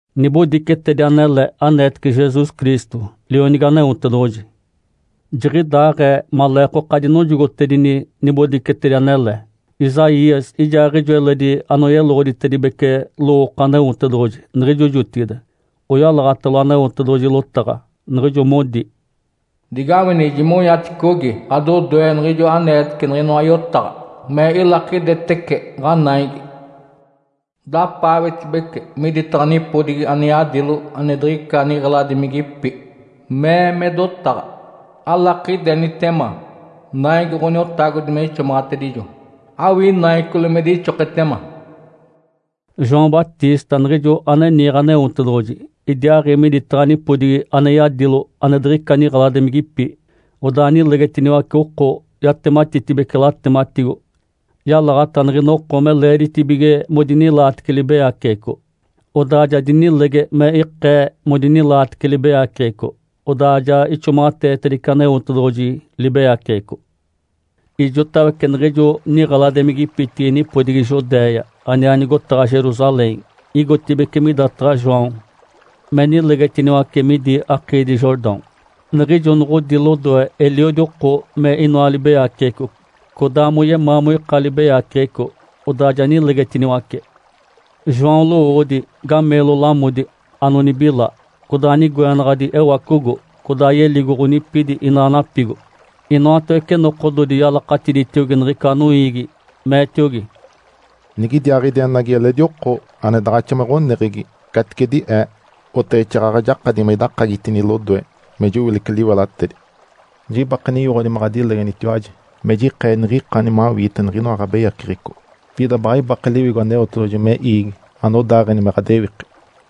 Nibodicetedi anele aneetece Jesus Cristo, Lionigi Aneotedoɡ̶oji. Jiɡ̶idaaɡ̶ee maleekoka dinojogotedini nibodicetedi anele. Isaías ijaaɡ̶ijo eledi anoyeloɡ̶oditedibece lowooko Aneotedoɡ̶oji niɡ̶ijo jotigide, oyalaɡ̶atalo Aneotedoɡ̶oji lotaɡ̶a, niɡ̶ijo modi, “Digawini! Jimonyaticogi ɡ̶adodoe niɡ̶ijo aneetece niɡ̶inoa yotaɡ̶a me ilakidetece ɡ̶anaigi. Dapaawetibece miditaɡ̶a nipodigi ane yadilo ane diɡ̶ica niɡ̶eladimigipi, mee me dotaɡ̶a, ‘Alakidenitema naigi Ǥoniotagodi me ixomaɡ̶atedijo! Awii naicoli me dixoketema!’” João Batista niɡ̶ijo ane niiɡ̶e Aneotedoɡ̶oji idiaaɡ̶i miditaɡ̶a nipodigi ane yadilo ane diɡ̶ica niɡ̶eladimigipi, odaa nilegetiniwace oko. Yatematitibece latematigo, yalaɡ̶ata niɡ̶ina oko me leeditibige modinilaatece libeyaceɡ̶eco, odaa ja dinilege me ikee modinilaatece libeyaceɡ̶eco, odaa ja ixomaɡ̶ateetedice Aneotedoɡ̶oji libeyaceɡ̶eco. Ijotawece niɡ̶ijo niɡ̶eladimigipitigi nipodigi Judéia, aniaa nigotaɡ̶a Jerusalém igotibeci midataɡ̶a João me nilegetiniwace midi akiidi Jordão. Niɡ̶ijo noɡ̶odi lodoe eliodi oko me inoa libeyaceɡ̶eco codaa moyemaa moika libeyaceɡ̶eco, odaa ja nilegetiniwace. João lowoodi, gameelo lamodi anonibila, codaa nigoenaɡ̶adi ewacogo. Codaa yeligo ɡ̶onipidi inaa napigo. Inoatawece nokododi yalakatiditiogi niɡ̶ica noiigi, meetiogi, “Nigidiaaɡ̶idi enagi eledi oko ane daɡ̶axa me ɡ̶oneɡ̶egi caticedi ee, oteɡ̶exaaɡ̶aɡ̶a jakadi me idakagitini lodoe me jowilece liwelatedi. Jibake ninyoɡ̶odi me ɡ̶adilegenitiwaji me jikee niɡ̶ikani mawiite niɡ̶inoa ɡ̶abeyaceɡ̶eco, pida baɡ̶a ibake Liwigo Aneotedoɡ̶oji me iigi anodaaɡ̶eni me ɡ̶adewiki.”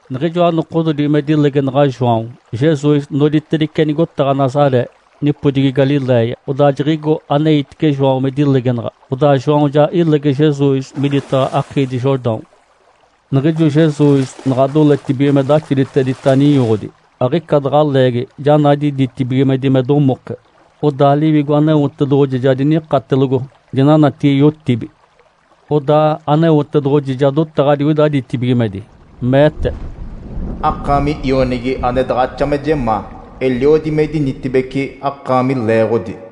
Niɡ̶ijoa nokododi me dilegenaɡ̶a João, Jesus noditedice nigotaɡ̶a Nazaré, nipodigi Galiléia. Odaa jiɡ̶igo aneitice João me dilegenaɡ̶a. Odaa João ja ilege Jesus miditaɡ̶a akiidi Jordão. Niɡ̶ijo Jesus naɡ̶a doletibige me daxoditedita ninyoɡ̶odi, aɡ̶ica daɡ̶a leegi, ja nadi ditibigimedi me domoke. Odaa Liwigo Aneotedoɡ̶oji ja dinikatelogo dinanatigi yotibi. Odaa Aneotedoɡ̶oji ja dotaɡ̶a digoida ditibigimedi, meete, “Akaami Ionigi ane daɡ̶axa me jemaa. Eliodi me idinitibeci akaami leeɡ̶odi.”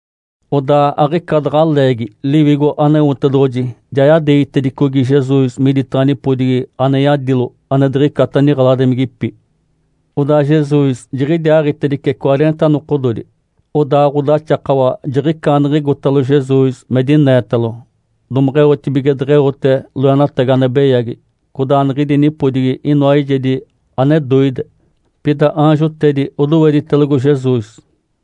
Odaa aɡ̶ica daɡ̶a leegi Liwigo Aneotedoɡ̶oji ja yadeegitedicogi Jesus miditaɡ̶a nipodigi ane yadilo ane diɡ̶icata niɡ̶eladimigipi. Odaa Jesus jiɡ̶idiaaɡ̶itedice cwareenta nokododi. Odaa Ǥodaxakawa jiɡ̶icaaniɡ̶igotalo Jesus me dineetalo, domeɡ̶eotibige deɡ̶eote loenatagi ane beyagi. Codaa niɡ̶idi nipodigi inoa eijedi ane doide, pida aanjotedi odoweditelogo Jesus.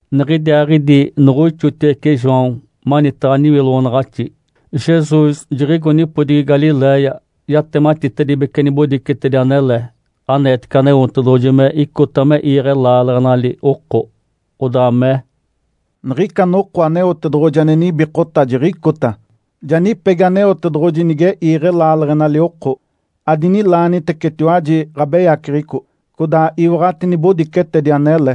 Niɡ̶idiaaɡ̶idi noɡ̶oixotiwece João manitaɡ̶a niwiloɡ̶onaɡ̶axi, Jesus jiɡ̶igo nipodigi Galiléia yatematitedibece nibodicetedi anele aneetece Aneotedoɡ̶oji me icota me iiɡ̶e laaleɡ̶enali oko. Odaa mee, “Niɡ̶ica noko Aneotedoɡ̶oji ane nibikota jiɡ̶icota. Ja nipegi Aneotedoɡ̶oji nige iiɡ̶e laaleɡ̶enali oko. Adinilaanitecetiwaji ɡ̶abeyaceɡ̶eco, codaa iwaɡ̶ati nibodicetedi anele.”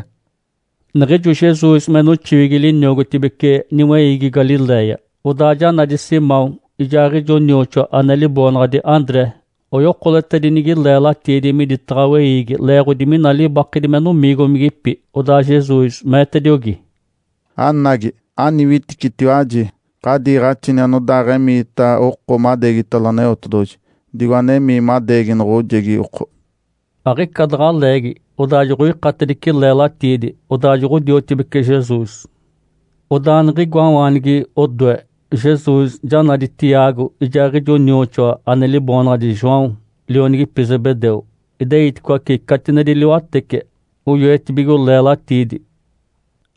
Niɡ̶ijo Jesus me noxiwigi liniogotibece niweiigi Galiléia, odaa ja nadi Simão ijaaɡ̶ijo nioxoa ane liboonaɡ̶adi André. Oyokoletedinigi leelatiidi miditaɡ̶a weiigi leeɡ̶odi mina libakedi me nomiigomigipi. Odaa Jesus meetediogi, “Anagi, aniwitibici! Ǥadiiɡ̶axini anodaaɡ̶emiita oko madeegitalo Aneotedoɡ̶oji, digo anemii madeegi noɡ̶ojegi oko.” Aɡ̶ica daɡ̶a leegi odaa joɡ̶oikatedice leelatiidi, odaa joɡ̶odiotibece Jesus. Odaa niɡ̶igoawaanigi odoe, Jesus ja nadi Tiago ijaaɡ̶ijo nioxoa ane liboonaɡ̶adi João, lionigipi Zebedeu. Ideiticoace catinedi liwatece, oyoetibigo leelatiidi.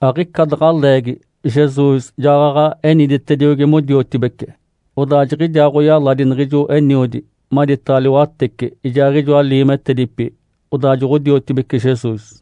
Aɡ̶ica daɡ̶a leegi Jesus jaɡ̶aɡ̶a eniditediogi modiotibece. Odaa jiɡ̶idiaaɡ̶oyaladi niɡ̶ijo eniodi maditaɡ̶a liwatece ijaaɡ̶ijoa liimetedipi, odaa joɡ̶odiotibece Jesus.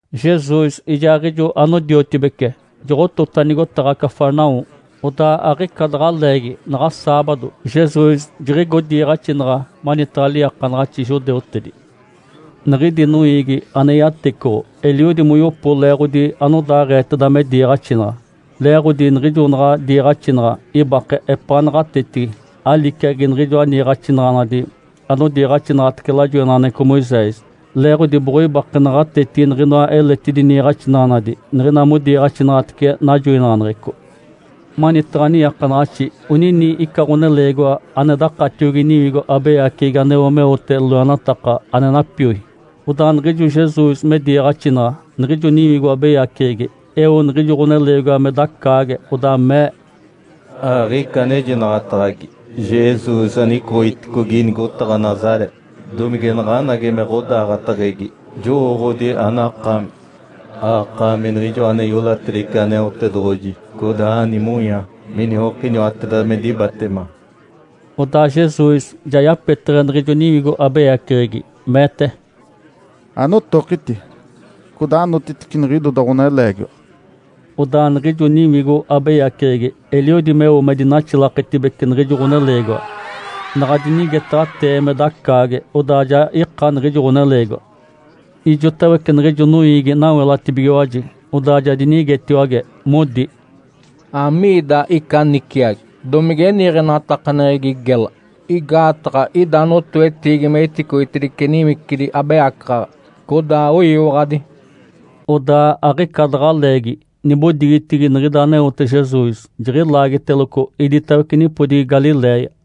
Jesus ijaaɡ̶ijo anodiotibece joɡ̶otota nigotaɡ̶a Cafarnaum. Odaa aɡ̶ica daɡ̶a leegi, naɡ̶a saabado, Jesus jiɡ̶igo diiɡ̶axinaɡ̶a manitaɡ̶a liiakanaɡ̶axi judeutedi. Niɡ̶idi noiigi ane yatecoɡ̶o eliodi moyopo leeɡ̶odi anodaaɡ̶eeteda me diiɡ̶axinaɡ̶a. Leeɡ̶odi niɡ̶ijo naɡ̶a diiɡ̶axinaɡ̶a, ibake epaa naɡ̶atetigi, aliciagi niɡ̶ijoa niiɡ̶axinaɡ̶anadi anodiiɡ̶axinaɡ̶atece lajoinaɡ̶aneɡ̶eco Moisés, leeɡ̶odi boɡ̶oibake naɡ̶atetigi niɡ̶inoa eletidi niiɡ̶axinaɡ̶anadi niɡ̶ina modiiɡ̶axinaɡ̶atece najoinaɡ̶aneɡ̶eco. Manitaɡ̶a niiakanaɡ̶axi onini ica ɡ̶oneleegiwa ane dakatiogi niwigo abeyaceɡ̶egi aneo meote loenataka ane napioi. Odaa niɡ̶ijo Jesus me diiɡ̶axinaɡ̶a, niɡ̶ijo niwigo abeyaceɡ̶egi eo niɡ̶ijo ɡ̶oneleegiwa me dacaage, odaa mee, “Aɡ̶ica anejinaɡ̶ataɡ̶agi, Jesus anicoɡ̶iticogi nigotaɡ̶a Nazaré! Domige naɡ̶anagi me ɡ̶odaaɡ̶ateɡ̶egi? Jowooɡ̶odi anakaami. Akaami Niɡ̶ijoa ane iolatedice Aneotedoɡ̶oji, codaa nimonya miniokiniwateda me dibatema.” Odaa Jesus ja yapeteɡ̶e niɡ̶ijo niwigo abeyaceɡ̶egi, meete, “Anotokiti, codaa anotitice niɡ̶idoda ɡ̶oneleegiwa!” Odaa niɡ̶ijo niwigo abeyaceɡ̶egi eliodi meo me dinaxilaketibece niɡ̶ijo ɡ̶oneleegiwa. Naɡ̶a dinigetaɡ̶atee me dacaage, odaa ja ika niɡ̶ijo ɡ̶oneleegiwa. Ijotawece niɡ̶ijo noiigi nawelatibigiwaji, odaa ja dinigetiwage, modi, “Amiida ica niciagi? Domige niiɡ̶enatakaneɡ̶egi gela? Igaataɡ̶a ida notoetiigi me iticoitedice niwicidi abeyacaɡ̶aɡ̶a, codaa oyiwaɡ̶adi!” Odaa aɡ̶ica daɡ̶a leegi, nibodigitigi niɡ̶ida aneote Jesus jiɡ̶ilaagiteloco iditawece nipodigi Galiléia.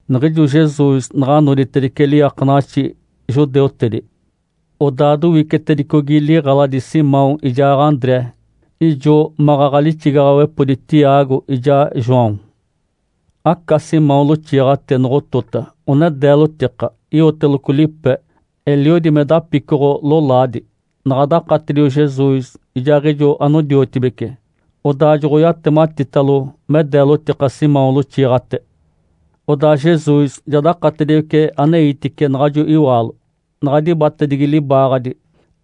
Niɡ̶ijo Jesus naɡ̶a noditedice liiakanaɡ̶axi judeutedi, odaa dowicetedicogi liɡ̶eladi Simão ijaa André. Ijo maɡ̶aɡ̶a lixigaɡ̶awepodi Tiago ijaa João. Aca Simão loxiiɡ̶ate noɡ̶otota one deelotika. Iwoteloco lipe, eliodi me dapicoɡ̶o-lolaadi. Naɡ̶a dakatedio Jesus ijaaɡ̶ijo anodiotibece, odaa joɡ̶oyatematitalo me deelotika Simão loxiiɡ̶ate. Odaa Jesus ja dakatediwece aneitice naɡ̶ajo iwaalo, naɡ̶a dibatedigi libaaɡ̶adi,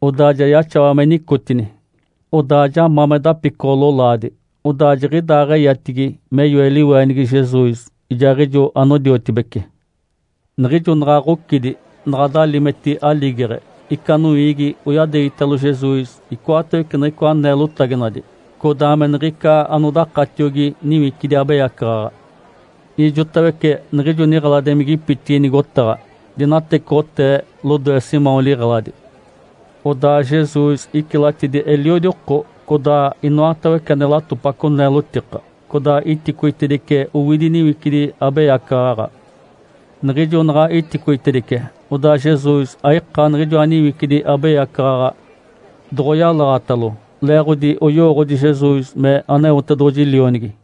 odaa ja yaxawa me nicotini. Odaa ja ma me dapicoɡ̶o-lolaadi, odaa jiɡ̶idaaɡ̶eyatigi me yoe liweenigi Jesus ijaaɡ̶ijo anodiotibece. Niɡ̶ijo naɡ̶a ɡ̶ocidi, naɡ̶a dalimeti aligeɡ̶e, ica noiigi oyadeegitalo Jesus icoatawece niɡ̶icoa neelotaginadi codaa me niɡ̶ica anodakatiogi niwicidi abeyacaɡ̶aɡ̶a. Ijotawece niɡ̶ijo niɡ̶eladimigipitigi nigotaɡ̶a dinatecoɡ̶otee lodoe Simão liɡ̶eladi. Odaa Jesus icilatidi eliodi oko, codaa inoatawece ane latopaco neelotika, codaa iticoitedice owidi niwicidi abeyacaɡ̶aɡ̶a. Niɡ̶ijo naɡ̶a iticoitedice, odaa Jesus aika niɡ̶ijoa niwicidi abeyacaɡ̶aɡ̶a doɡ̶oyalaɡ̶atalo leeɡ̶odi oyowooɡ̶odi Jesus me Aneotedoɡ̶oji Lionigi.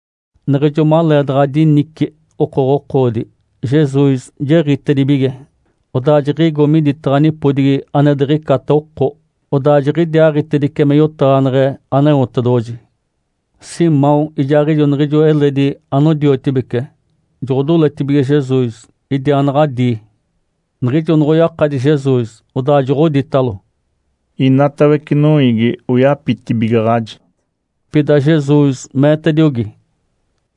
Niɡ̶ijo maleedaɡ̶a dinici okoɡ̶okoodi, Jesus jiɡ̶itedibige, odaa jiɡ̶igo miditaɡ̶a nipodigi ane diɡ̶icata oko. Odaa jiɡ̶idiaaɡ̶itedice me yotaɡ̶aneɡ̶e Aneotedoɡ̶oji. Simão ijaaɡ̶ijo niɡ̶ijo eledi anodiotibece joɡ̶odoletibige Jesus idiaanaɡ̶adii. Niɡ̶ijo noɡ̶oyakadi Jesus, odaa joɡ̶oditalo, “Inatawece noiigi oyapitibigaɡ̶aji.” Pida Jesus meetediogi,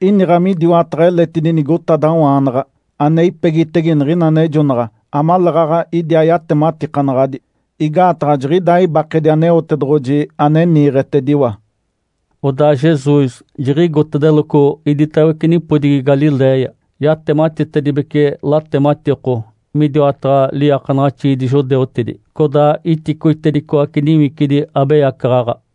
“Iniɡ̶a midiwataɡ̶a eletidi nigotadawaanaɡ̶a ane ipegitege niɡ̶ina anejonaɡ̶a amaleeɡ̶aɡ̶a idiaa yatematikanaɡ̶adi. Igaataɡ̶a jiɡ̶idaa ibakedi Aneotedoɡ̶oji ane niiɡ̶etediwa.” Odaa Jesus jiɡ̶igotedeloco iditawece nipodigi Galiléia, yatematitedibece latematiko midiwataɡ̶a liiakanaɡ̶axiidi judeutedi, codaa iticoitedicoace niwicidi abeyacaɡ̶aɡ̶a.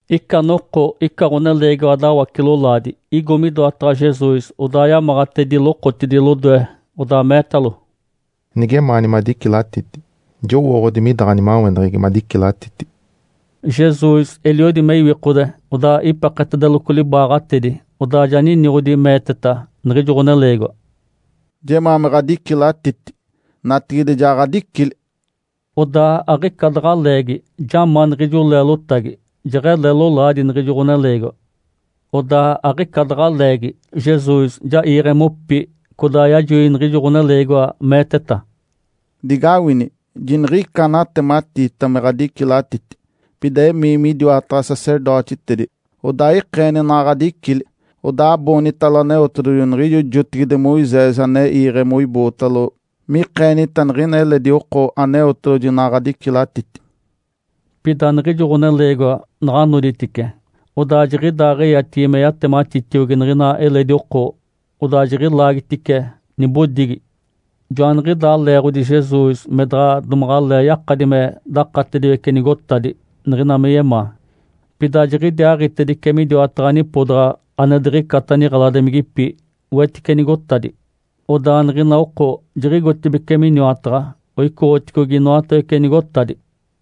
Ica noko ica ɡ̶oneleegiwa dawace-lolaadi igo midoataɡ̶a Jesus, odaa yamaɡ̶atedi lokotidi lodoe, odaa meetalo, “Nigemaani madicilatiti, jowooɡ̶odi mida ɡ̶animaweneɡ̶egi madicilatiti.” Jesus eliodi me iwikode, odaa ipeketedeloco libaaɡ̶atedi, odaa ja niniɡ̶odi, meeteta niɡ̶ijo ɡ̶oneleegiwa, “Jemaa me ɡ̶adicilatiti! Natigide, ja ɡ̶adicili!” Odaa aɡ̶ica daɡ̶a leegi, ja ma niɡ̶ijo leelotagi, jeɡ̶ele lolaadi niɡ̶ijo ɡ̶oneleegiwa. Odaa aɡ̶ica daɡ̶a leegi, Jesus ja iiɡ̶e mopi. Codaa yajoi niɡ̶ijo ɡ̶oneleegiwa, meeteta, “Digawini! Jiniɡ̶ica anatematiita me ɡ̶adicilatiti. Pida emii midiwataɡ̶a sacerdotitedi, odaa ikeeni naɡ̶a ɡ̶adicili. Odaa aboonitalo Aneotedoɡ̶oji niɡ̶ijo jotigide Moisés ane iiɡ̶e moibootalo mikeenita niɡ̶ina eledi oko Aneotedoɡ̶oji naɡ̶a ɡ̶adicilatiti.” Pida niɡ̶ijo ɡ̶oneleegiwa naɡ̶a noditice, odaa jiɡ̶idaaɡ̶eyatigi me yatematitiogi niɡ̶ina eledi oko, odaa jiɡ̶ilaagitice nibodigi. Joaniɡ̶idaa leeɡ̶odi Jesus me daɡ̶a domaɡ̶alee yakadi me dakatediwece nigotadi niɡ̶ina me yemaa. Pida jiɡ̶idiaaɡ̶itedice midiwataɡ̶a nipodaɡ̶a ane diɡ̶icata niɡ̶eladimigipi, wetice nigotadi. Odaa niɡ̶ina oko jiɡ̶igotibeci miniwataɡ̶a, oicoɡ̶oticogi inoatawece nigotadi.